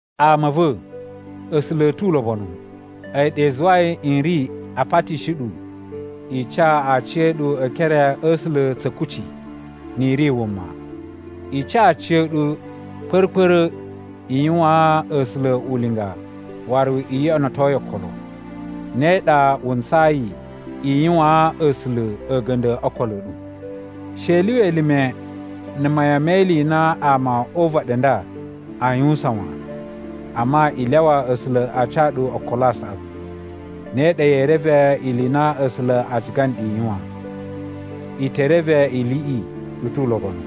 Ama a̱ va̱, A̱sula̱ a̱ tu ulobonu, a̱yi ɗa i zuwai n ri a patishi ɗu i ca aciya̱ɗu e ekere a̱ A̱sula̱ tsa̱ kucci, ni i ri wuma. I ca aciya̱ɗu kpa̱ra̱-kpa̱ra̱ i yuwaan A̱sula̱ ulinga waru i yoꞌonoto yi okolo. Ne ɗa wu ntsayi i yuwaan A̱sula̱ a̱ga̱nda̱ o okolo a̱ ɗu. She i lyuwa elime na̱ mayan me ili i na ama o uvaɗi u nda aa yuwusan wan, amma, i lyawa A̱sula̱ a ca ɗu okolo a saꞌavu. Ne ɗa yee reve ili i na A̱sula̱ a ciga nɗu i yuwan: I te reve iliꞌi i tu ulobonu,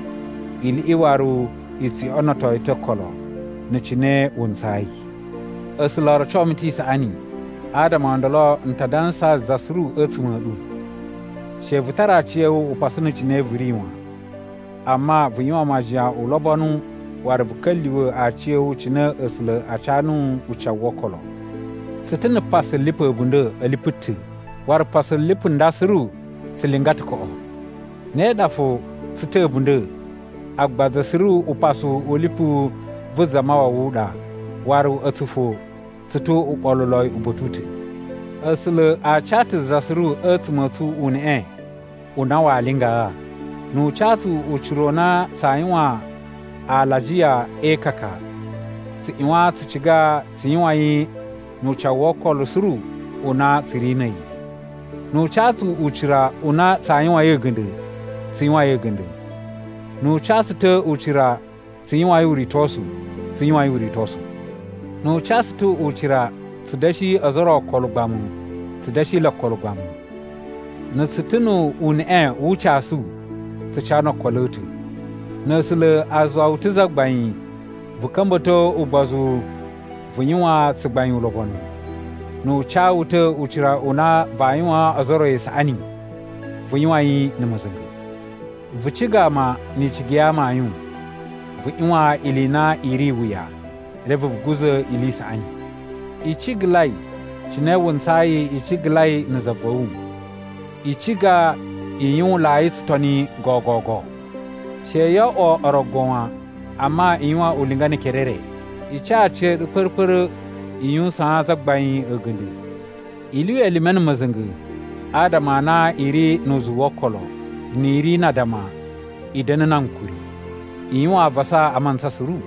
iliꞌi waru i tsu yoꞌonoto yi ta̱ okolo, na̱ cine wu ntsayi. A̱sula̱ o roco mu ta̱ isaꞌani, adama o ndolo n ta dansaa za suru a̱tsuma̱ a̱ ɗu: She vu tara aciya̱wu upasu na̱ cine vu ri wan, amma vu yuwan majiyan ulobonu waru vu ka̱lyuwa̱ aciya̱wu cine A̱sula̱ a ca nuwu ucawu wo okolo. Tsu ta̱ na̱ pasu lipu a̱bunda̱ a̱ lipu ta̱, waru pasu lipu nda suru tsu linga ta̱ koꞌo. Ne ɗa fo, tsu ta̱ a̱bunda̱, agba za suru upasu u lipu vu Zamawawa u ɗa, waru a̱tsu fo tsu tu uɓoluloi uba̱ta̱ u ta̱. A̱sula̱ a ca ta̱ za suru a̱tsuma̱ a̱ tsu uneꞌe u na waa lingaa. Nu u ca tsu ucira u na tsaa yuwan alajiya e ikaka, tsu ꞌyuwan tsu ciga tsu yuwan yi nu ucawu wo okolo suru u na tsu ri na̱ a̱yi. Nu u ca tsu ucira u na tsaa yuwain a̱ga̱nda̱, tsu yuwain a̱ga̱nda̱. Nu u ca tsu ta̱ ucira tsu yuwain uritosu, tsu yuwain uritosu. Nu u ca tsu ta̱ ucira tsu da̱shi ozo o ro okolo ugbamu, tsu da̱shi le okolo ugbamu. Na̱ tsu ta̱ nu uneꞌe wu ucasu, tsu ca no okolo a̱ ta̱. Na̱ A̱sula̱ a zuwa wu ta̱ zagbain, vu ka̱mba̱to ugbozu vu yuwan tsugbain ulobonu. Nu u ca wu ta̱ ucira u na vaa yuwaan ozo o ro isaꞌani, vu yuwan yi na̱ ma̱za̱nga̱. Vu ciga ama ni icigi ya amayun. Vu ꞌyuwan ili i na i ri iwuya, reve vu guza̱ ili i saꞌani. I cigalai cine wu ntsayi i cigalai na̱ za va̱ wu. I ciga i yuwunlai tsutoni gogogo. She yo oꞌwo orogo wan, amma i yuwan ulinga ne ekere e re. I ca aciya̱ɗu kpa̱ra̱-kpa̱ra̱ i yuwusaan Zagbain a̱ga̱nda̱. I lyuwa elime na̱ ma̱za̱nga̱ adama a na i ri nu uzuwu wo okolo. Ni i ri na addama i da̱na̱ na ankuri. I yuwan avasa a mantsa suru.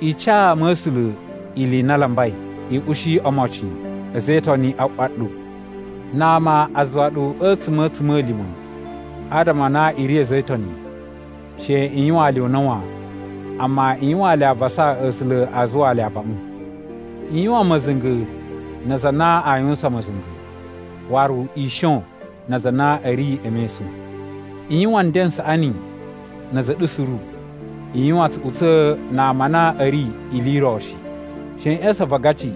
I ca ama a̱ A̱sula̱ ili i na a lambai. I ushi omocin a̱za̱ e Itoni a ꞌwa ɗu. Na ama a zuwa ɗu a̱tsuma̱ a̱ a̱tsuma̱lima̱ adama a na i ri a̱za̱ e Itoni, she i yuwaan le una̱ wan. Amma i yuwaan le avasa A̱sula̱ a zuwaa le abaꞌun. I yuwan ma̱za̱nga̱ na aza a na a yuwusan ma̱za̱nga̱, waru i shon na aza a na a̱ ri e mesun. I yuwan nden n saꞌani na̱ a̱za̱ a̱ ɗu suru. I yuwan tsuꞌutsa̱ na ama a na a̱ ri ili i ro shi. She i ꞌya̱sa̱n avangaci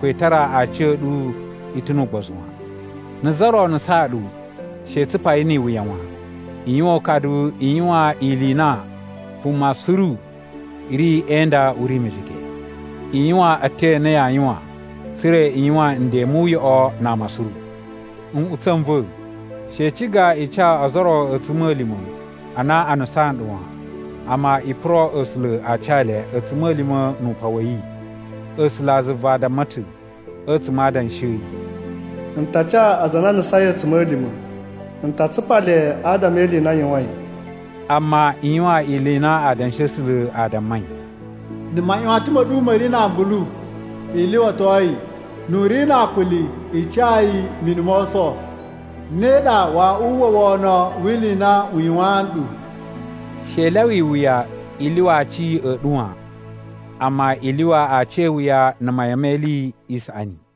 ko i tara aciya̱ɗu i ta̱ nu ugbozu wan. Na̱ za ro nusaan ɗu, she i tsupa yi ni iwuya wan. I yuwan ukadu i yuwan ili i na vuma suru ri e inda u ri mejege. I yuwan a̱tyo a na yaa yuwan tsa̱ra̱ i yuwan nden mu uyoꞌo na ama suru. Nꞌutsa̱ n va̱, she i ciga i ca ozo o ro a̱tsuma̱lima̱ a na a nusaan ɗu wan, amma i puro A̱sula̱ a ca le a̱tsuma̱lima̱ nu upan wa̱ yi. A̱sulazuva damma ta̱ a̱tsuma̱ a Adanshi a̱ yi, “N ta ca aza a na a nusain a̱tsuma̱lima̱. N ta tsupa le adama e ili i na a yuwain.” Amma i yuwan ili i na Adanshi a̱ A̱sula̱ a dammai: “Na̱ maꞌyuwatan ma̱ ɗu ma̱ ri na ambulu, i lyuwato yi. Nu u ri na akuli, i ca yi mini mo oso. Ne ɗa waa uwwa wono wi ili i na u yuwaan nɗu.” She i lyawa iwuya i lyuwa aci a̱ ɗu wan, amma i lyuwa aci e iwuya na̱ mayan me ili i saꞌani.